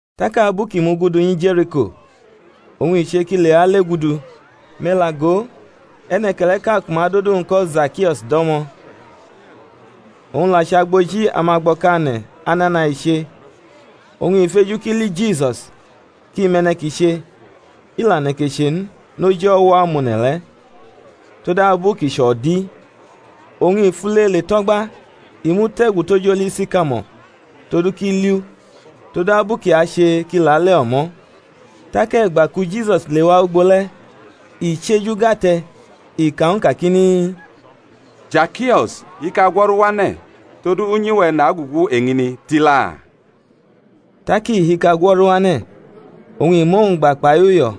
Tak abu kʼi mugudu nyi Je̩riko oñ i che kʼi lewa legudu, me̩ la go, e̩ne̩ke̩le̩ʼka ku ma dʼodu-wñ ko̩ Zakio̩s do̩mo̩, owñ la chʼagboji amagbo̩kane̩, anana i che. Oñ i feju kʼi li Jisus, kʼi mʼe̩ne̩ kʼi che; i la neke che n, noji o̩wo̩-amone̩ le̩, todabu kʼi chʼo̩di. Oñ i fule le tʼo̩gba, i mute̩gu toj oli sikamo̩r todu kʼi liʼu: todu abu kʼi ache kʼi lale o̩mo̩. Tak e̩gba ku Jisus lewa ugbo le̩ i chʼeju gʼate̩ i ka ñw u kakini, Zakio̩s, hika gwo̩ru wane̩; todu unyi-we̩ nagugu eñini, tila. Tak i hika gwo̩ru wane̩, oñ i mʼowñ gba kpai uyo̩.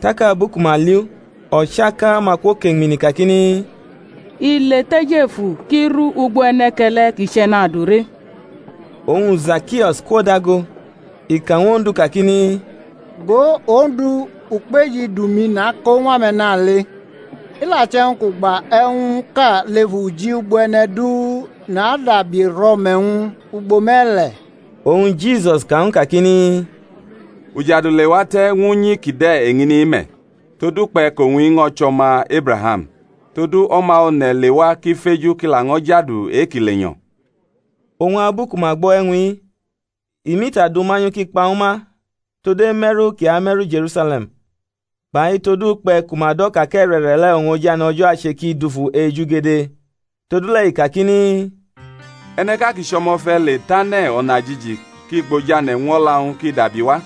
Tak abu ku ma li u, o̩chaka-ma kwokeñmini kakini, I le tʼejefu kʼi ru ugbo e̩ne̩ke̩le̩ kʼi chʼe̩nadure. Oñ Zakio̩s kwodago, i ka ñw Ondu kakini, Go, Ondu, ukpeji idu-mi nako ñw ame̩nale; i la che̩wñ kʼu gba e̩wñʼka lef uji ugbo e̩ne̩ du nadabi rʼo̩me̩-wñ ugbo me̩le̩. Oñ Jisus ka ñw u kakini, Ujadu lewate̩ ñw unyi kide̩ eñini-i me̩, todukpe̩ kʼowñ-i ño̩ chʼo̩ma Ebraham. Todu O̩ma One̩ lewa kʼi feju kʼi laño̩ jadu e-ki lenyo̩. Oñ abu ku ma gbo̩ e̩wñ-i, i mʼita du manyu kʼi kpa ñwu ma tod eme̩ru kʼi ame̩ru Je̩rusale̩m kpai todukpe̩ ku ma do̩ ka kʼe̩re̩re̩le̩ oñ ojane̩ O̩jo̩ ache ki dufu ejugede. Todule̩ i kakini, E̩ne̩ʼka kʼi chʼo̩mo̩fe̩ le tʼane̩ o̩najiji, kʼi gbʼojane̩ ñw o̩la-wñ kʼi dabiwa.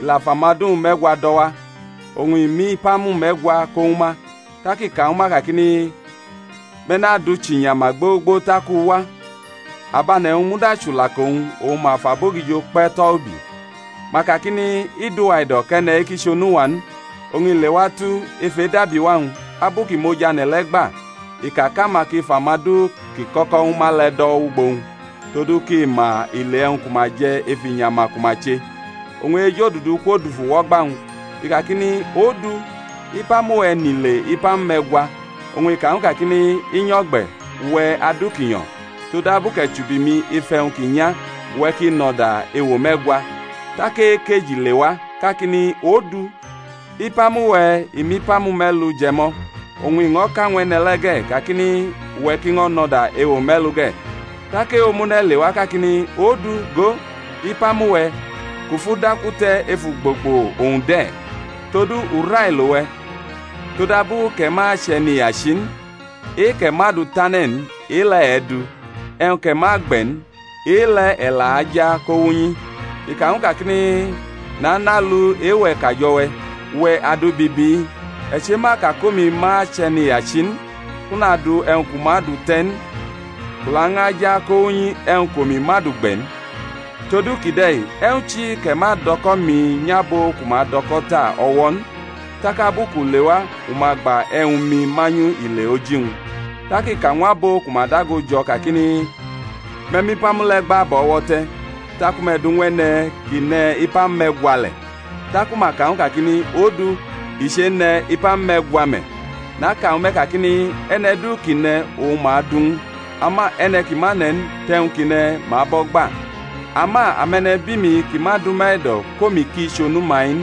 I la fʼamadu-wñ me̩gwa do̩wa, oñ i mʼipamu me̩gwa ko ñwu ma, tak i ka ñwu ma kakini, Me̩ nadʼu chinyama gbogbo tak u wa. Abane̩-wñ muda chulaka-wñ oñ ma fʼabogijo kpe̩ tʼo̩ ubi, ma kakini, I dʼuwa e̩do̩ kʼe̩ne̩-i ki chʼonu-wa n. Oñ i leatu, ef edabiwa-wñ, abu kʼi mʼojane̩ le̩ gba, i ka kʼama ki fʼamadu kʼi kʼo̩ko̩ ñwu ma le̩ do̩ wʼugbo-wñ, todu kʼi ma ile e̩wñ ku ma je̩ ef inyama ku ma che. Oñ e-ejodudu kwodufu wʼo̩gba-wñ, i kakini, Odu, ipamu-we̩ nʼile ipamu me̩gwa. Oñ i ka ñw u kakini, I nyo̩ gbe̩, uwe̩, adu ki nyo̩; todabu kʼe̩ chubi mi ef e̩wñ ki nya, uwe̩ ki nʼo̩da ewo me̩gwa. Tak e-ekeji lewa kakini, Odu, ipamu-we̩ i mʼipamu me̩lu je̩ mʼo̩. Oñ i ño̩ ka ñw e̩ne̩ le̩ ge̩ kakini, Uwe̩ ki ño̩ nʼo̩da ewe me̩lu ge̩. Tak e-omune̩ lewa kakini, Odu, go, ipamu-we̩, kʼu fʼu daku te̩ ef ugbogbo, owñ de̩: todu u railo we̩, todabu kʼe̩ ma chʼe̩niyachi n: e-kʼe̩ ma du tʼane̩ n, e-le̩ e̩ du, e̩wñ kʼe̩ ma gbe̩ n, e-le̩ e̩ la aja ko wʼunyi. I ka ñw u kakini, Nanʼalu e-we̩ kajo̩ we̩, uwe̩ adu bibi-i. E̩ chema ka kʼomi ma chʼe̩niyachi n, kʼu nadu e̩wñ kʼu ma du te̩ n, kʼu laño̩ aja kowʼunyi e̩wñ kʼomi ma du gbe̩ n; todu kide̩ e̩wñ chi kʼe̩ ma dʼo̩ko̩-mi nyʼabo ku ma dʼo̩ko̩ ta o̩wo̩ n? tak abu kʼu lewa u ma gba e̩wñ-mi manyu ile oji-wñ, tak i ka ñw abo ku ma dago jo̩ kakini, Me̩ mʼipamu le̩ gba bʼo̩ o̩wo̩ te̩, ku me̩ du ñw e̩ne̩ ki ne̩ ipamu me̩gwa le̩. Taku ma ka ñw u kakini, Odu, i chene̩ ipamu me̩gwa me̩. Naka ñwu me̩ kakini, E̩ne̩ du ki ne̩ oñ ma adu ñw u: ama e̩ne̩ ki ma ne̩ n, tʼe̩wñ kʼi ne̩ ma abʼo̩ gba. Ama ame̩ne̩bi-mi ki ma dʼuma e̩do̩ kʼomi ki chʼonu-ma-i n,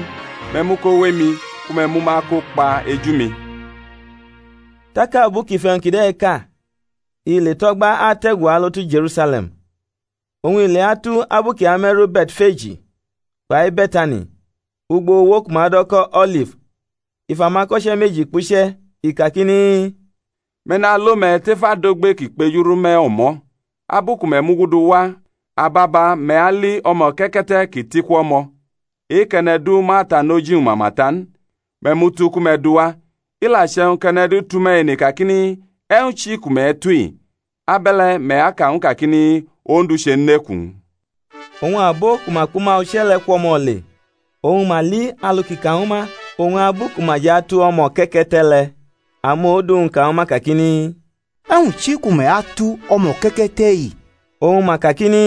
me̩ mu ko wʼemi, ku me̩ mʼuma kokpa eju-mi. Tak abu kʼi fʼe̩wñ kide̩ ka, i le tʼo̩gba ate̩gu alo tu Je̩rusale̩m. Oñ i leatu, abu kʼi ame̩ru Be̩tfeji kpai Be̩tani, ugbo uwo ku ma dʼo̩ ko̩ O̩lif, i fʼamako̩che̩ meji kpuche̩, i kakini, Me̩ nalo me̩ tef adogbe ki kpejuru me̩ o̩mo̩; abu ku me̩ mugudu wa ababa me̩ ali o̩mo̩ke̩ke̩te̩ ki tʼiku o̩mo̩, e-kʼe̩ne̩ du ma tanʼoji-wñ mama ta n; me̩ mʼu tu ku me̩ duwa. I la che̩wñ kʼe̩ne̩ du tʼume̩ ene kakini, E̩wñ chi ku me̩ atu-i? Abe̩le̩ me̩ aka ñw u kakini, Ondu chenʼeku-wñ. Oñ abo ku ma kpʼuma uche̩ le̩ kwʼo̩mo̩ le, oñ ma li alu kʼi ka ñwu ma. Oñ abu ku ma jʼatu o̩mo̩ke̩ke̩te̩ le̩, amodu-wñ, ka ñwu ma kakini, E̩wñ chi ku me̩ atu o̩mo̩ke̩ke̩te̩-i? Oñ ma kakini,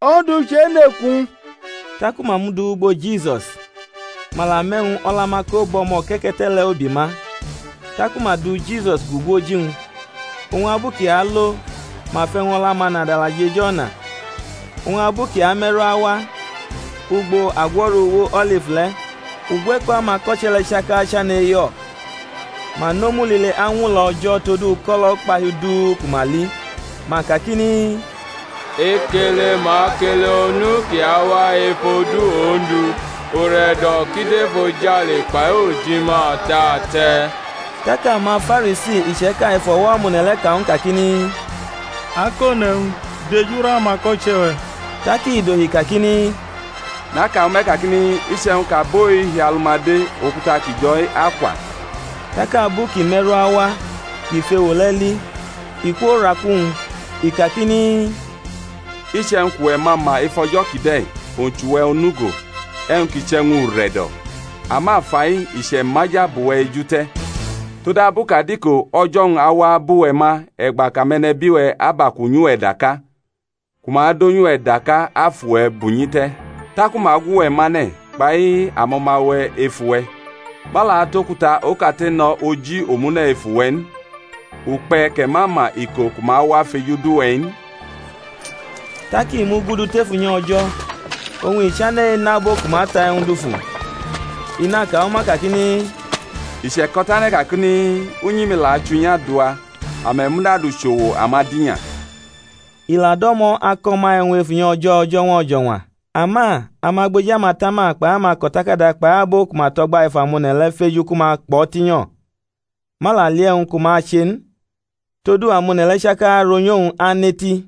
Ondu chenʼeku-wñ. Taku ma mʼu du wʼugbo Jisusi: ma la mʼe̩wñ o̩la-ma ko bʼo̩mo̩ke̩ke̩te̩ le̩ ubi ma, taku ma du Jisusi gugu oji-wñ. Oñ abu kʼi alo ma fʼe̩wñ o̩la-ma nadala jʼejʼo̩na. Oñ abu kʼi ame̩ru awa, ugbo agwo̩ru uwo O̩lif le̩, ugwe̩ko̩ amako̩che̩ le̩ chaka chane̩ e̩yo̩, ma nʼomu lile añwulo̩ O̩jo̩ todu uko̩lo̩ ukpahiu du ku ma li, ma kakini, Ekele ma kele Onu kʼi awa ef odu Ondu; ure̩do̩ ki dʼefojale kpai ojima ate̩ ate̩. Tak amaFarisi iche̩ka ef o̩wo̩ amone̩ le̩ ka ñw u kakini, Akone̩wñ, dejuru amako̩che̩-we̩. Tak i dohi kakiru, Naka ñwu me̩ kakini, Iche̩wñ kʼabo-i hiʼalu-ma de, okuta ki jo̩-i akwa. Tak abu kʼi me̩ru awa, kʼi fʼewo le̩ li i kworaku-wñ, I kakini, Iche̩wñ kʼuwe̩ ma ma ef o̩jo̩ kide̩, owñ chʼuwe̩ onugo, e̩wñ kʼi chʼe̩wñ ure̩do̩! Ama fai i che̩maja bʼuwe̩ eju te̩. Todabu kʼadiko o̩jo̩-wñ awa bʼuwe̩ ma e̩gba kʼame̩nebi-we̩ abʼaku nyʼuwe̩ daka, ku ma donyʼuwe̩ daka afʼuwe̩ bunyi te̩, taku ma agwʼuwe̩ mane̩, kpai amo̩ma-we̩ efu-we̩; ma la atʼokuta okate no̩ oji omune̩ efu-we̩ n; ukpe̩ kʼe̩ ma ma iko ku ma wa feju dʼuwe̩-i n. Tak i mugudu tef unyi O̩jo̩, oñ i chane̩ enʼabo ku ma ta e̩wñ dufu, i naka ñwu ma kakini, I che̩ko̩tane̩ kakini, Unyi-mi la achʼunyi adua; ame̩ muda dʼu chʼo̩wo̩ amadinya. I la do̩mo̩ ako̩ ma e̩wñ ef unyi O̩jo̩ o̩jo̩ñwa o̩jo̩ñwa. Ama amagboji amatama kpai amako̩takada kpai abo ku ma to̩gba ef amone̩ le̩ feju ku ma kpʼo̩ tinyo̩: ma la li e̩wñ ku ma ache n; todu amone̩ le̩ chaka ronyʼowñ aneti.